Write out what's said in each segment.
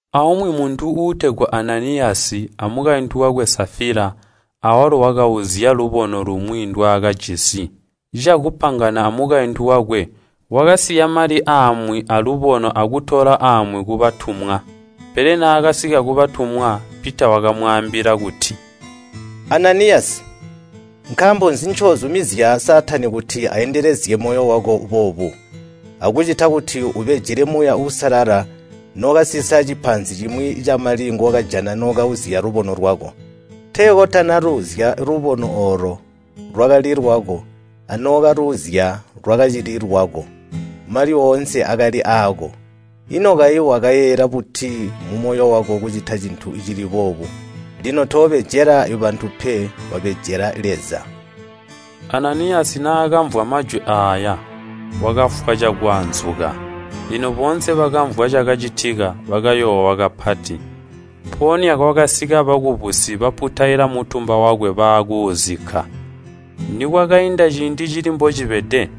Aumwi muntu uutegwa Ananiyasi, amukaintu wakwe Safila, awalo wakauzya lubono lumwi ndwaakajisi. Cakupangana amukaintu wakwe, wakasiya mali amwi aalubono akutola amwi kubatumwa. Pele naakasika kubatumwa, Pita wakamwaambila kuti, “Ananiyasi, nkaambo nzi ncoozumizya Saatani kuti aendelezye moyo wako boobu, akukucita kuti ubejele Muuya Uusalala nookasisa cipaanzi cimwi camali ngookajana nookauzya lubono lwako? Tee kotanaluuzya lubono oolo, lwakali lwako anookaluuzya lwakacili lwako, mali oonse akali aako. Ino kayi wakayeeyela buti mumoyo wako kucita cintu cili boobu? Lino toobejela bantu pe, wabejela Leza!” Ananiyasi naakamvwa majwi aaya wakafwa cakwaanzuka. Lino boonse bakamvwa cakacitika, bakayoowa kapati. Mpoonya kwakasika bakubusi baputaila mutumba wakwe baakuuzikka. Nikwakainda ciindi cili mbocibede,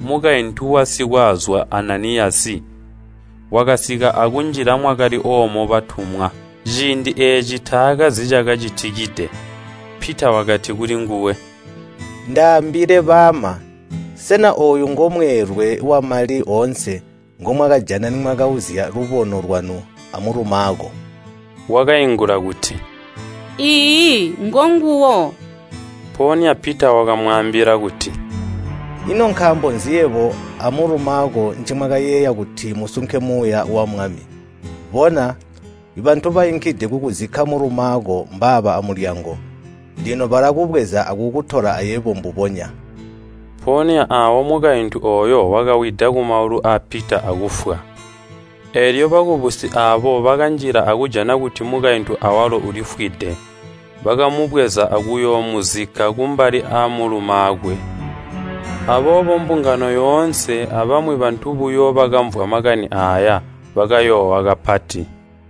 mukaintu wa sikwaazwa Ananiyasi wakasika akunjila mwakali oomo batumwa. Ciindi eeci taakazi cakacitide. Pita wakati kulinguwe, “Ndaambile baama, sena ooyu ngomweelwe wamali oonse ngomwakajana nimwakauzya lubono lwanu amulumaako?” Wakaingula kuti, “Iiyi ngonguwo.” Mpoonya Pita wakamwaambila kuti, “Ino nkaambo nzi yebo amulumaako nimwakayeeya kuti musunke Muuya wa Mwami? Bona, bantu bainkide kukuzikka mulumaako mbaaba amulyango, lino balakubweza akukutola ayebo mbubonya!” Mpoonya aawo mukaintu ooyo wakawida kumaulu aa Pita akufwa. Eelyo bakubusi aabo bakanjila akujana kuti mukaintu awalo ulifwide. Bakamubweza akuyoomuzikka kumbali amulumaakwe. Aboobo mbungano yoonse abamwi bantu buyo bakamvwa makani aaya bakayoowa kapati.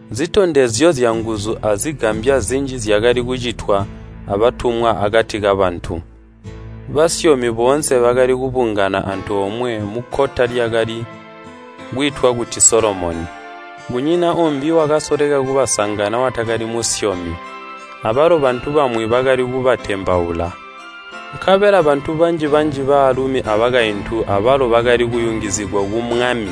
Nzitondezyo zyanguzu azigambya zinji zyakali kucitwa abatumwa akati kabantu. Basyomi boonse bakali kubungana antoomwe mukkota lyakali kwiitwa kuti Solomoni. Kunyina uumbi wakasoleka kubasangana watakali musyomi, abalo bantu bamwi bakali kubatembaula. Nkabela bantu banji-banji baalumi abakaintu abalo bakali kuyungizigwa ku Mwami.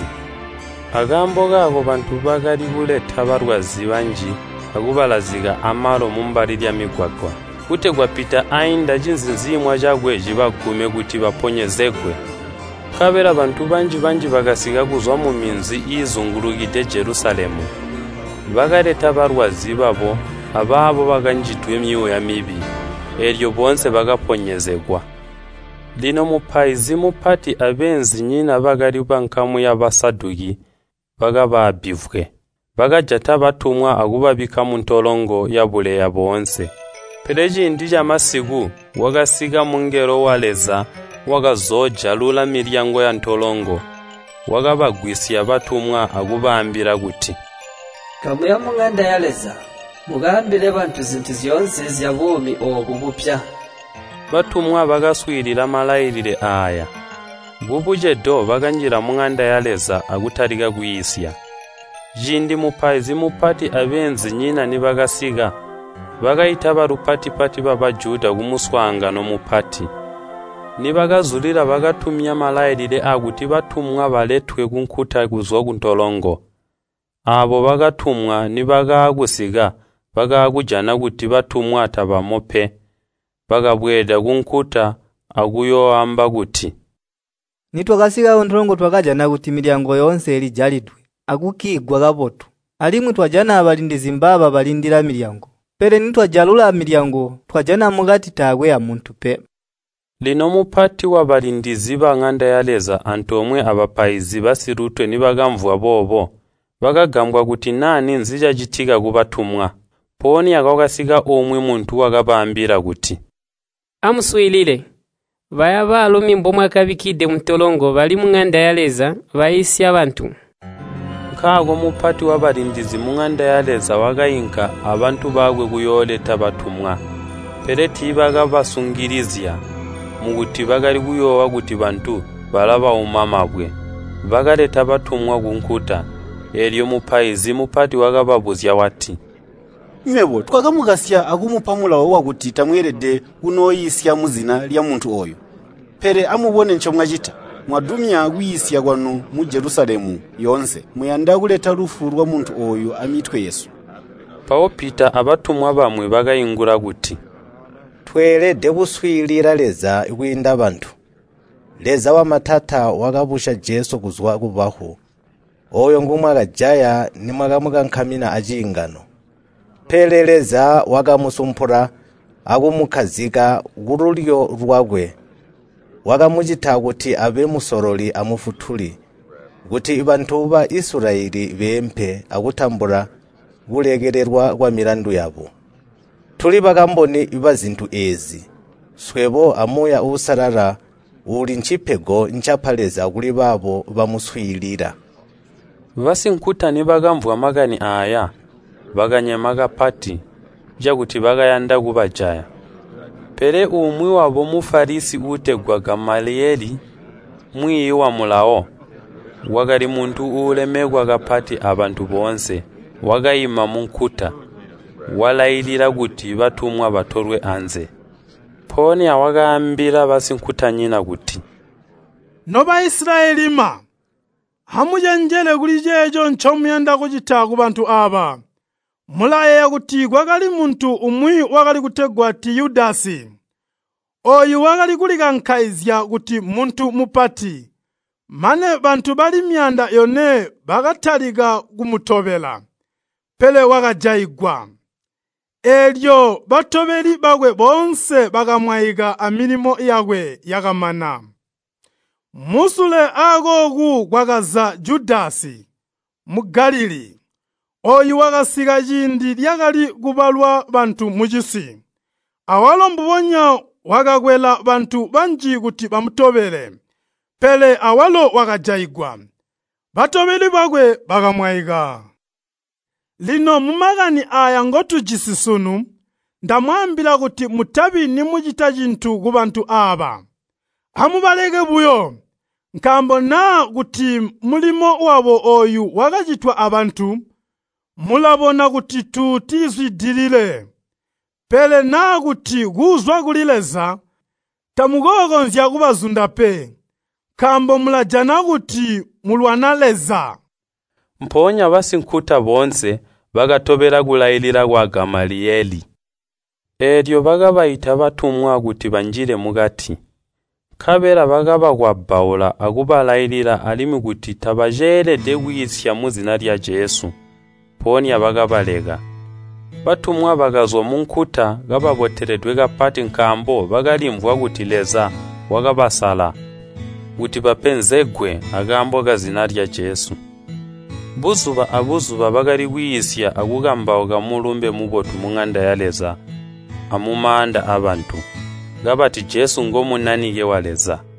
Akaambo kaako bantu bakali kuleta balwazi banji akubalazika amalo mumbali lyamigwagwa, kutegwa Pita ainda cinziinzimwa cakwe cibagume kuti baponyezegwe. Nkabela bantu banji-banji bakasika kuzwa muminzi iizingulukide Jelusalemu. Bakaleta balwazi babo abaabo bakanjidwe myuuya mibi, eelyo boonse bakaponyezegwa. Lino mupaizi mupati abeenzinyina bakali bankamu ya Basaduki bakaba abbivwe. Bakajata batumwa akubabikka muntolongo yabuleya boonse. Pele ciindi camasiku kwakasika mungelo wa Leza wakazoojalula milyango yantolongo, wakabagwisya batumwa akubaambila kuti, “Kamuya muŋanda ya Leza, mukaambile bantu zintu zyoonse zyabuumi oobu bupya.” Batumwa bakaswiilila malailile aaya, kubucedo bakanjila muŋanda ya Leza akutalika kwiisya. Ciindi mupaizi mupati abeenzinyina nibakasika, bakaita balupati-pati ba Bajuda kumuswaangano mupati. Nibakazulila bakatumya malailile aakuti batumwa baletwe kunkuta kuzwa kuntolongo. Aabo bakatumwa nibakaakusika bakaakujana kuti batumwa tabamo pe. Bakabweeda kunkuta akuyooamba kuti, “Nitwasika kuntolongo twajana kuti milyango yoonse ilijalidwe akukkiigwa kabotu, alimwi twajana abalindizi mbaaba balindila milyango. Pele nitwajalula milyango, twajana mukati taakwe amuntu pe!” Lino mupati wabalindizi baŋanda ya Leza antoomwe abapaizi basilutwe nibakamvwa boobo bakagambwa kuti naa ninzi cacitika kubatumwa. Mpoonya kwakasika umwi muntu wakabaambila kuti, “Amuswiilile! Baya baalumi mbomwakabikkide muntolongo bali muŋanda ya Leza, baiisya bantu!” Nkaako mupati wabalindizi muŋanda ya Leza wakainka abantu bakwe kuyooleta batumwa. Pele tiibakabasungilizya, mukuti bakali kuyoowa kuti bantu balabauma mabwe. Bakaleta batumwa kunkuta. Eelyo mupaizi mupati wakababuzya wati, “Nywebo twakamukasya akumupa mulawo wakuti tamweelede kunooiisya muzina lyamuntu ooyu. Pele amubone ncomwacita! Mwadumya kwiisya kwanu mu Jelusalemu yoonse. Muyanda kuleta lufu lwamuntu ooyu amitwe yesu!” Mpawo Pita abatumwa bamwi bakaingula kuti, “Tweelede kuswiilila Leza kwiinda bantu. Leza wamatata wakabusya Jesu kuzwa kubafu, ooyo ngomwakajaya nimwakamukankamina aciingano. Pele Leza wakamusumpula akumukkazika kululyo lwakwe. Wakamucita kuti abe Musololi a Mufutuli, kuti bantu ba Isilayeli beempe akutambula kulekelelwa kwamilandu yabo. Tuli bakamboni bazintu eezi, swebo a Muuya Uusalala uuli ncecipego ncapa Leza kuli baabo bamuswiilila.” Basinkuta nibakamvwa makani aaya, bakanyema kapati, cakuti bakayanda kubajaya. Pele umwi wabo Mufalisi uutegwa Gamaliyeli, mwiiyi wa Mulawo, wakali muntu uulemekwa kapati abantu boonse, wakaima munkuta, walailila kuti batumwa batolwe anze. Mpoonya wakaambila basinkutanyina kuti, “No Baisilayelima, amucenjele kuli ceeco ncomuyanda kucita kubantu aaba. Mulayeeya kuti kwakali muntu umwi wakali kutegwa Tiyudasi. Ooyu wakali kulikankaizya kuti mmuntu mupati, mane bantu bali myaanda yone bakatalika kumutobela. Pele wakajaigwa, eelyo batobeli bakwe boonse bakamwaika amilimo yakwe yakamana. Musule aakooku kwakaza Judasi, Mugalilii. Ooyu wakasika ciindi lyakali kubalwa bantu mucisi. Awalo mbubonya, wakakwela bantu banji kuti bamutobele. Pele awalo wakajaigwa, batobeli bakwe bakamwaika. Lino mumakani aaya ngotujisi sunu, ndamwaambila kuti mutabi nimucita cintu kubantu aaba, amubaleke buyo. Nkaambo naa kuti mulimo wabo ooyu wakacitwa abantu, mulabona kuti tuutizwidilile. Pele naa kuti kuuzwa kuli Leza, tamukookonzya kubazunda pe, nkaambo mulajana kuti mulwana Leza!” Mpoonya basinkuta boonse bakatobela kulailila kwa Gamaliyeli. Eelyo bakabaita batumwa kuti banjile mukati, nkabela bakabakwabbaula akubalailila alimwi kuti tabaceelede kwiisya muzina lya Jesu, mpoonya bakabaleka. Batumwa bakazwa munkuta kababoteledwe kapati nkaambo bakalimvwa kuti Leza wakabasala kuti bapenzegwe akaambo kazina lya Jesu. Buzuba abuzuba bakali kwiisya akukambauka Mulumbe Mubotu muŋanda ya Leza amumaanda aabantu, kabati Jesu ngo Munanike wa Leza.